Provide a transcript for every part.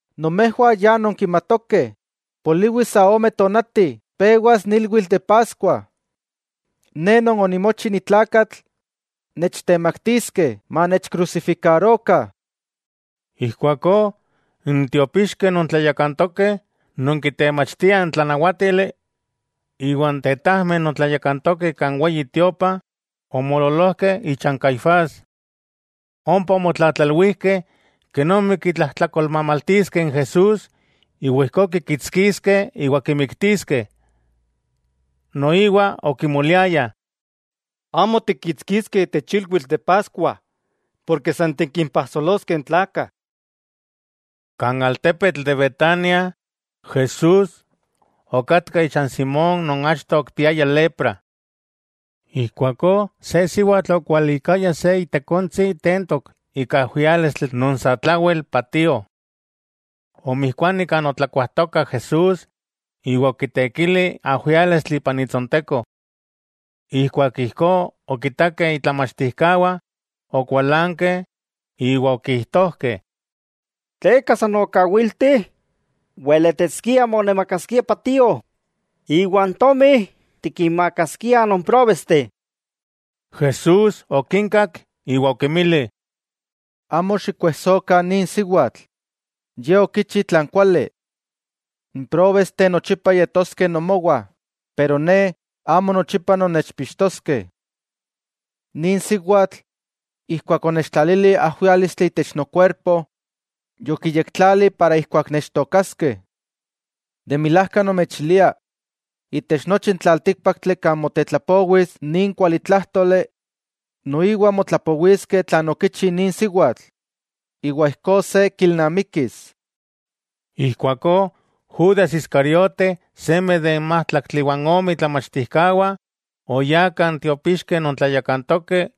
—Nomejwah ya nonkimatokeh, poliwi sa ome tonati pewas n ilwitl de Paskua. Ne Non onimochi ni tlakatl nechtemaktiskeh manechkrusifikarokah. Ijkuakó n tiopixkeh non tlayakantokeh, non kitemachtiah n tlanawátili, iwa n tetajmeh non tlayakantokeh kan Weyi Tiopa, omoololojkeh icha n Caifás. Ompa omotlatlalwijkeh kenomi kitlajtlakolmamaltiskeh n Jesús iwa ijkó kikitskiskeh iwa kimiktiskeh. Noiwa okimoliayah: —Amo tikkitskiskeh itech ilwitl de Paskua, porke san tikimpajsoloskeh n tlakah. Kan altepetl de Betania, Jesús okatka icha n Simón non achto okipiaya lepra. Ijkuakó se siwatl okualikaya se itekontsi tentok ika ajwiálistli non satlawel patio. Omijkuani kan otlakuajtoka Jesús iwa okitekili ajwiálistli ipan itsonteko. Ijkuak ijkó okitakeh itlamachtijkawah okualankeh iwa okijtojkeh: —¿Tleka san okawilti? Weletiskia monamakaskia patio, iwa n tomi tikinmakaskiah non próbesteh. Jesús okinkak iwa okinmili: —Amo xikkuejsokah nin siwatl, ye okichi tlan kuali. N próbesteh nochipa yetoskeh nomowah, pero Ne, amo nochipa nonnechpixtoskeh. Nin siwatl, ijkuak onechtlalili ajwiálistli itech nokuerpo, yotlayektlali para ijkuak nechtookaskeh. De milajka nomechilia, itech nochi n tlaltíkpaktli kan motetlapowis nin kualitlájtoli, noiwa motlapowiskeh tlan okichi nin siwatl, iwa ijkó se kilnamikis. Ijkuakó Judas Iscariote seme de n májtlaktli iwa n ome itlamachtijkawah, oyá kan tiopixkeh non tlayakantokeh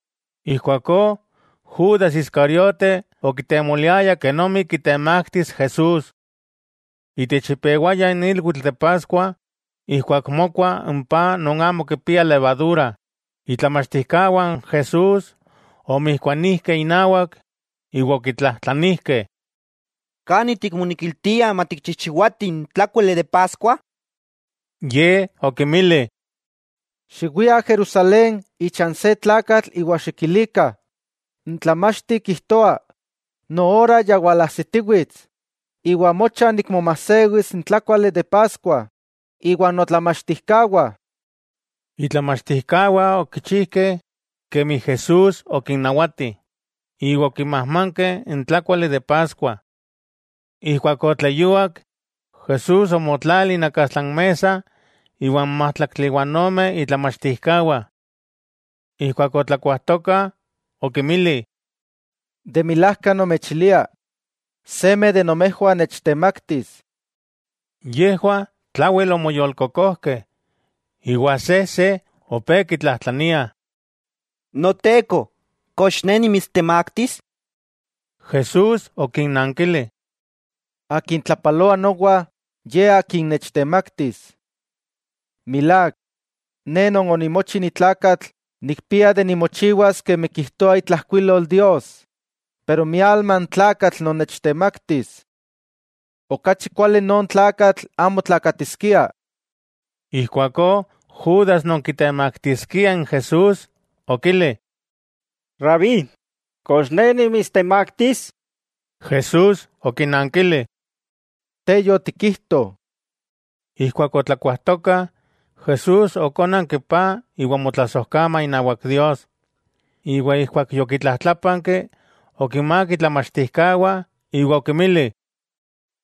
Ijkuakó, Judas Iscariote okitemoliaya kenomi kitemaktis Jesús. Itech ipewaya n ilwitl de Paskua ijkuak mokua n paj non amo kipia levadura, itlamachtijkawah n Jesús omijkuanijkeh inawak, iwa okitlajtlanijkeh: —¿Kani tikmonekiltia matikchijchiwatih n tlákuali de Paskua? Ye okinmili: —Xiwiah Jerusalén icha n se tlakatl iwa xikilikah: “N Tlamachti kijtoa: Noora ya walajsitiwits, iwa mocha nikmomajsewis n tlákuali de Paskua iwan notlamachtijkawah.” Itlamachtijkawah okichijkeh kemi Jesús okinnawati, iwa okimajmankeh n tlákuali de Paskua. Ijkuak otleyuak, Jesús omotlali inakastla n mesa iwa n májtlaktli iwa ome itlamachtijkawah. Ijkuak otlakuajtokah okinmili: —De milajka nomechilia, seme de nomejwah nechtemaktis. Yejwah tlawel omoyolkokojkeh, iwa sejse opé kitlajtlania: —Noteko, ¿kox ne nimitstemaktis? Jesús okinnankili: —Akin tlapaloa nowa, ye akin nechtemaktis. Milák, Ne Non onimochi ni tlakatl nikpia de nimochiwas kemi kijtoa itlajkuilol Dios, pero ¡mialma n tlakatl non nechtemaktis! Okachi kuali non tlakatl amo tlakatiskia. Ijkuakó Judas non kitemaktiskia n Jesús okili: —Rabí, ¿kox ne nimitstemaktis? Jesús okinankili: —Te yotikijto. Ijkuak otlakuajtokah, Jesús okónanki paj iwa omotlasojkama inawak Dios, iwa ijkuak yokitlajtlápanki, okinmák itlamachtijkawah iwa okinmili: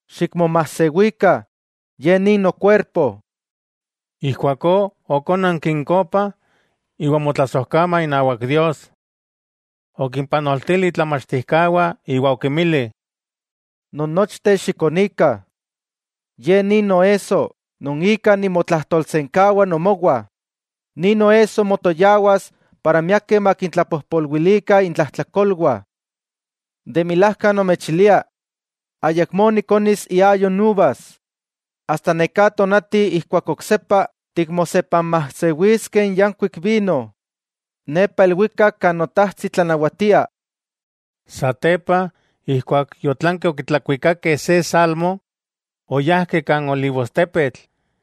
—Xikmomajsewikah, ye nin nokuerpo. Ijkuakó okónanki n kopa, iwa omotlasojkama inawak Dios. Okimpanoltili itlamachtijkawah iwa okinmili: —Nonnochteh xikonikah, ye nin noesso non ika nimotlajtolsenkawa nomowah, nin noesso motoyawas para miakeh makintlapojpolwilikah intlajtlakolwah. De milajka nomechilia: Ayakmó nikonis iayo n uvas, asta neká tonati ijkuak oksepa tikmosepanmajsewiskeh n yankuik vino, nepa ilwikak kan Notajtsi tlanawatia. Satepa, ijkuak yotlankeh okitlakuikakeh se salmo oyájkeh kan Olivostepetl.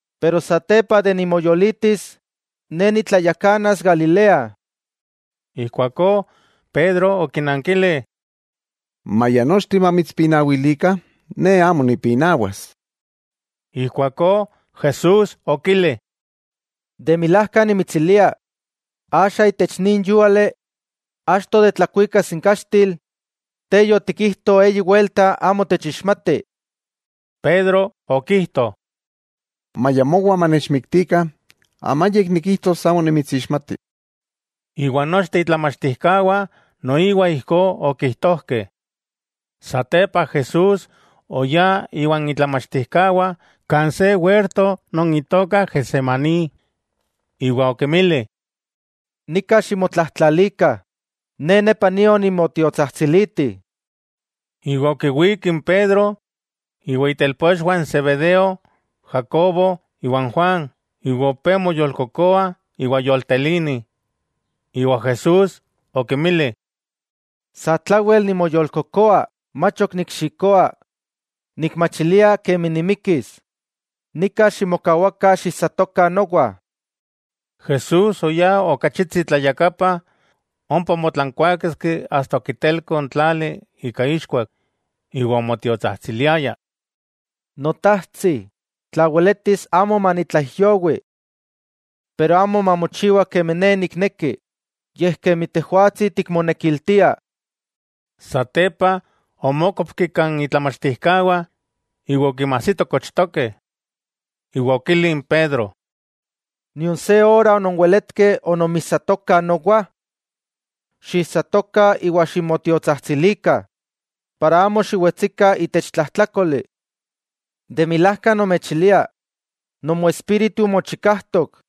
Pero keman nimoyolitis, Ne nitlayakanas Galilea. Ijkuakó Pedro okinankili: —Maya nochteh mamitspinawilikah ne amo nipinawas. Ijkuakó Jesús okili: —De milajka nimitsilia, axa itech nin yúali achto de tlakuikas n kaxtil, te yotikijto eyi welta amo techixmati. Pedro okijto: —Maya mowa manechmiktikah, amayik nikijtos amo nimitsixmati. Iwa nochteh itlamachtijkawah noiwa ijkó okijtojkeh. Satepa Jesús oyá iwan itlamachtijkawah kan se werto non itoka Getsemaní, iwa okinmili: —Nika ximotlajtlalikah, Ne nepa nio nimotiotsajtsiliti. Iwa okiwík n Pedro, iwa itelpochwah n Zebedeo, Jacobo iwa n Juan iwa opé moyolkokoa iwa yoltelini. Iwa Jesús okinmili: —Satlawel nimoyolkokoa mach ok nikxikoa, nikmachilia kemi nimikis, nika ximokawakah xiijsatokah nowa. Jesús oyá ok achitsi tlayakapa, ompa omotlankuáketski asta okitelko n tlali ika ixkuak iwa omotiotsajtsiliaya: —Notajtsi, tla weletis amo manitlaijyowi. Pero amo mamochiwa kemi Ne nikneki, yej kemi Tejwatsi tikmonekiltia. Satepa omókopki kan itlamachtijkawah, iwa okinmajsito kochtokeh, iwa okili n Pedro: —¿Nion se ora ononweletkeh ononmijsatokah nowa? Xiijsatokah iwa ximotiotsajtsilikah, para amo xiwetsikah itech tlajtlákoli. De milajka nomechilia, nomoespíritu mochikajtok,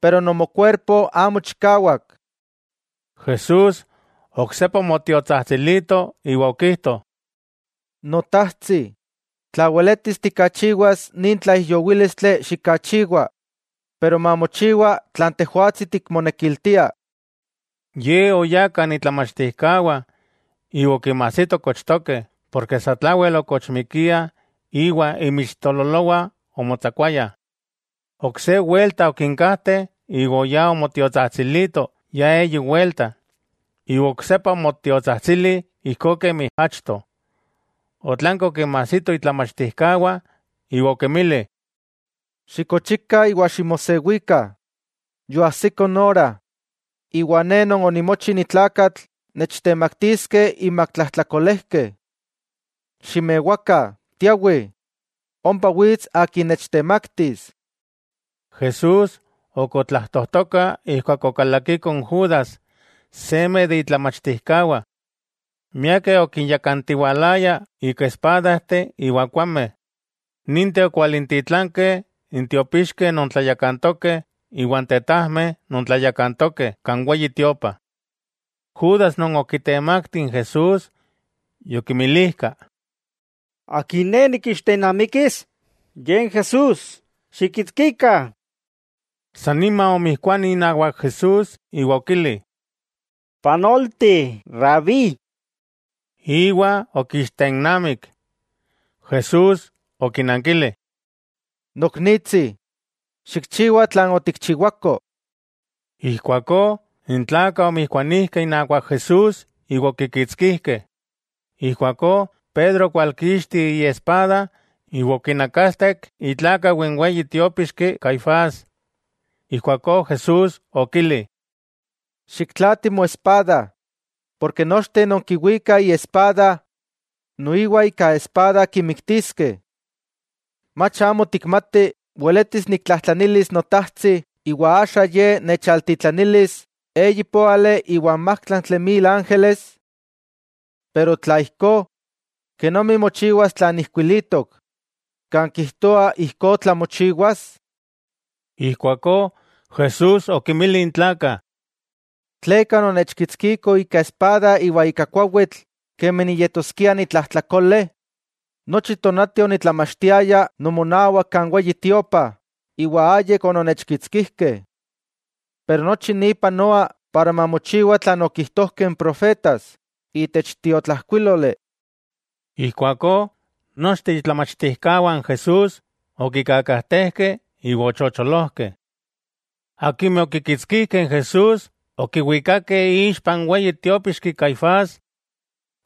pero nomokuerpo amo chikawak. Jesús oksepa omotiotsajtsilito iwa okijto: —Notajtsi, tla weletis tikachiwas nin tlaijyowílistli xikachiwa, pero mamochiwa tlan Tejwatsi tikmonekiltia. Ye oyá kan itlamachtijkawah, iwa okinmajsito kochtokeh porke satlawel okochmikiah iwa inmixtololowah omotsakuayah. Ok se welta okinkajteh iwa oyá omotiotsajtsilito ya eyi welta, iwa oksepa omotiotsajtsili ijkó kemi achto. Otlanki okinmajsito itlamachtijkawah iwa okinmili: —Xikochikah iwa ximosewikah. Yoajsiko n ora, iwa Ne Non onimochi ni tlakatl nechtemaktiskeh inmak tlajtlakolejkeh. ¡Ximewakah, tiawih! ¡Ompa wits akin nechtemaktis! Jesús ok otlajtojtoka ijkuak okalakiko n Judas, seme de itlamachtijkawah. Miakeh okinyakantiwalaya ika espadajteh iwa kuameh. Ninteh okwalintitlankeh n tiopixkeh non tlayakantokeh iwa n tetajmeh non tlayakantokeh kan Weyi Tiopa. Judas non okitemakti n Jesús, yokinmilijka: —Akin ne nikixtennamikis, Ye n Jesús, ¡xikkitskikah! Sannima omijkuani inawak Jesús iwa okili: —¡Panolti Rabí! Iwa okiixtennamik. Jesús okinankili: —Noknitsi, xikchiwa tlan otikchiwako. Ijkuakó n tlakah omijkuanijkeh inawak Jesús iwa okikitskijkeh. Ijkuakó Pedro okwalkixti iespada iwa okinakastek itlákau n weyi tiópixki Caifás. Ijkuakó Jesús okili: —Xiktlaati moespada, porke akimeh kiwikah iespada, noiwa ika espada kinmiktiskeh. ¿Mach amo tikmati weletis niktlajtlanilis Notajtsi iwa axa Ye nechalintitlanilis eyipóali iwa n májtlaktli mil ángeles? Tla ijkó, ¿kenomi mochiwas tlan ijkuilitok, kan kijtoa ijkó tlamochiwas? Ijkuakó Jesús okinmili n tlakah: —¿Tleka ononnechkitskikoh ika espada iwa ika kuawitl kemi niyetoskia ni tlajtlakole? Nochi tonati onitlamachtiaya nomonawak kan Weyi Tiopa, iwa ayik ononnechkitskijkeh. Pero nochi ni panoa para mamochiwa tlan okijtojkeh n profetas itech tiotlajkuíloli. Ijkuakó nochteh itlamachtijkawah n Jesús okikakajtejkeh iwa ochocholojkeh. Akimeh okikitskijkeh n Jesús okiwikakeh ixpa n weyi tiópixki Caifás,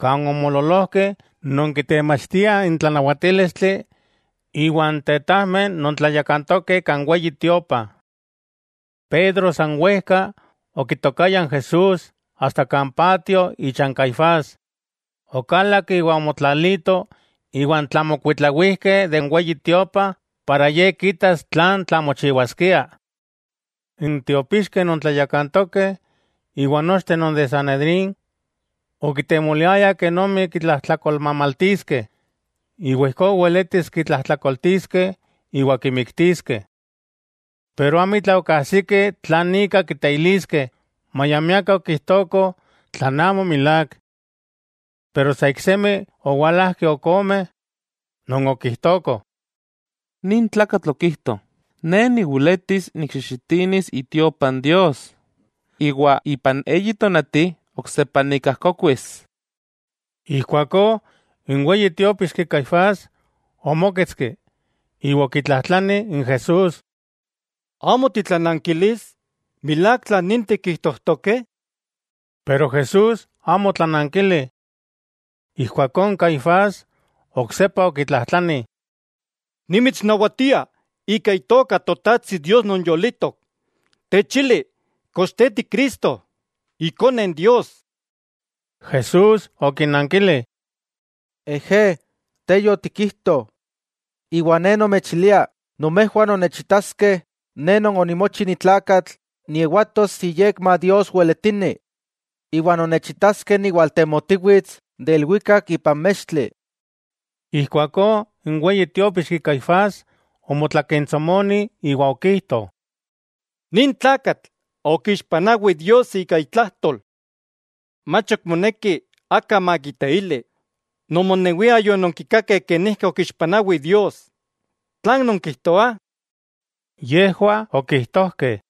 kan omoololojkeh non kitemachtiah n tlanawatílistli iwa n tetajmeh non tlayakantokeh kan Weyi Tiopa. Pedro san wejka okitokaya n Jesús asta kan patio icha n Caifás, okalak iwa omotlalito iwan tlamokuitlawijkeh de n Weyi Tiopa iwa ijkó kitas tlan tlamochiwaskia. N tiopixkeh non tlayakantokeh, iwa nochteh non de Sanedrín okitemoliayah kenomi kitlajtlakolmamaltiskeh, iwa ijkó weletis kitlajtlakoltiskeh iwa kimiktiskeh. Pero amitla okajsikeh tlan ika kiteiliskeh, maya miakeh okijtokoh tlan amo milák. Pero sa iksemi owalajkeh ok ome, non okijtokoh: —Nin tlakatl okijto: “Ne niweletis nikxijxitinis itiopa n Dios, iwa ipan eyi tonati oksepa nikajkokuis.” Ijkuakó n weyi tiópixki Caifás omóketski, iwa okitlajtlani n Jesús: —¿Amo titlanankilis? ¿Milák tlan ninteh kijtojtokeh? Pero Jesús amo otlanankili. Ijkuakó n Caifás oksepa okitlajtlani: —Nimitsnawatia ika itoka Totajtsi Dios non yolitok, techili kox Te Ti Cristo, Ikone Dios. Jesús okinankili: —Ejé, te yotikijto. Iwa Ne nomechilia nomejwah nonnechitaskeh Ne Non onimochi ni tlakatl niewatos iyekma Dios Weletini, iwa nonnechitaskeh niwaltemotiwits de ilwikak ipan mextli. Ijkuakó n weyi tiópixki Caifás, omotlakentsomoni iwa okijto: —¡Nin tlakatl okixpanawi Dios ika itlajtol! Mach ok moneki aka makiteili, nomonewiah yononkikakeh kenijki okixpanawi Dios. ¿Tlan nonkijtoah? Yejwah okijtojkeh: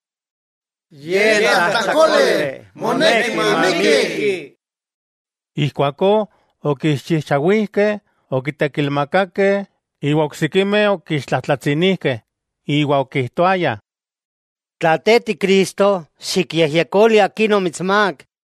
—Tlajtlakole, moneki mamikki. Ijkuakó okiixchijchawijkeh, okitekilmakakeh, iwa oksikimeh okixtlajtlatsinijkeh iwa okijtoayah: —Tla Te Ti Cristo, ¡xikyejyekoli akin omitsmák!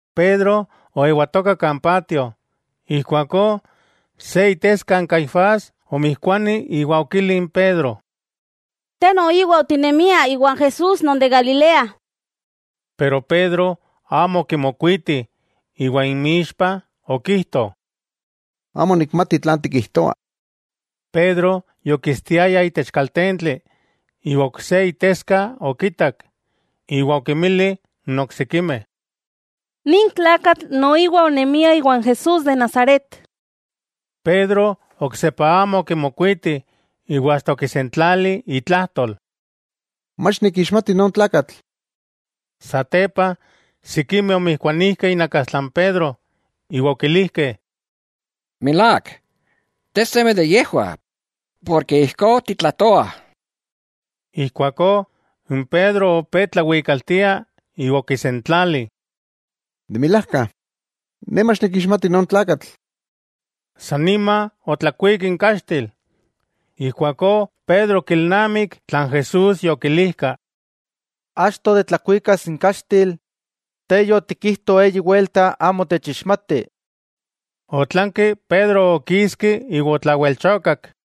Pedro oewatoka kala, ijkuakó se iteska n Caifás omijkuani iwa okili n Pedro: —Te noiwa otinemia iwan Jesús non de Galilea. Pedro amo okimokuiti iwa inmixpa okijto: —Amo nikmati tlan tikijtoa. Pedro yokistiaya itech kaltentli, iwa ok se iteska okitak, iwa okinmili n oksikimeh: —Nin tlakatl noiwa onemia iwan Jesús de Nazaret. Pedro oksepa amo okimokuiti, iwa asta okisentlali itlajtol: —Mach nikixmati non tlakatl. Satepa sikimeh omijkuanijkeh inakastla n Pedro iwa okilijkeh: —Milák, te seme de yejwah, porke ijkó titlajtoa. Ijkuakó n Pedro opé tlawikaltia iwa okisentlali: —De milajka, ne mach nikixmati non tlakatl. Sanima otlakuik n kaxtil. Ijkuakó Pedro okilnamik tlan Jesús yokilijka: “Keman ayamó tlakuika n kaxtil, te yotikijto eyi welta amo techixmati.” Otlanki Pedro okiski iwa otlawelchokak.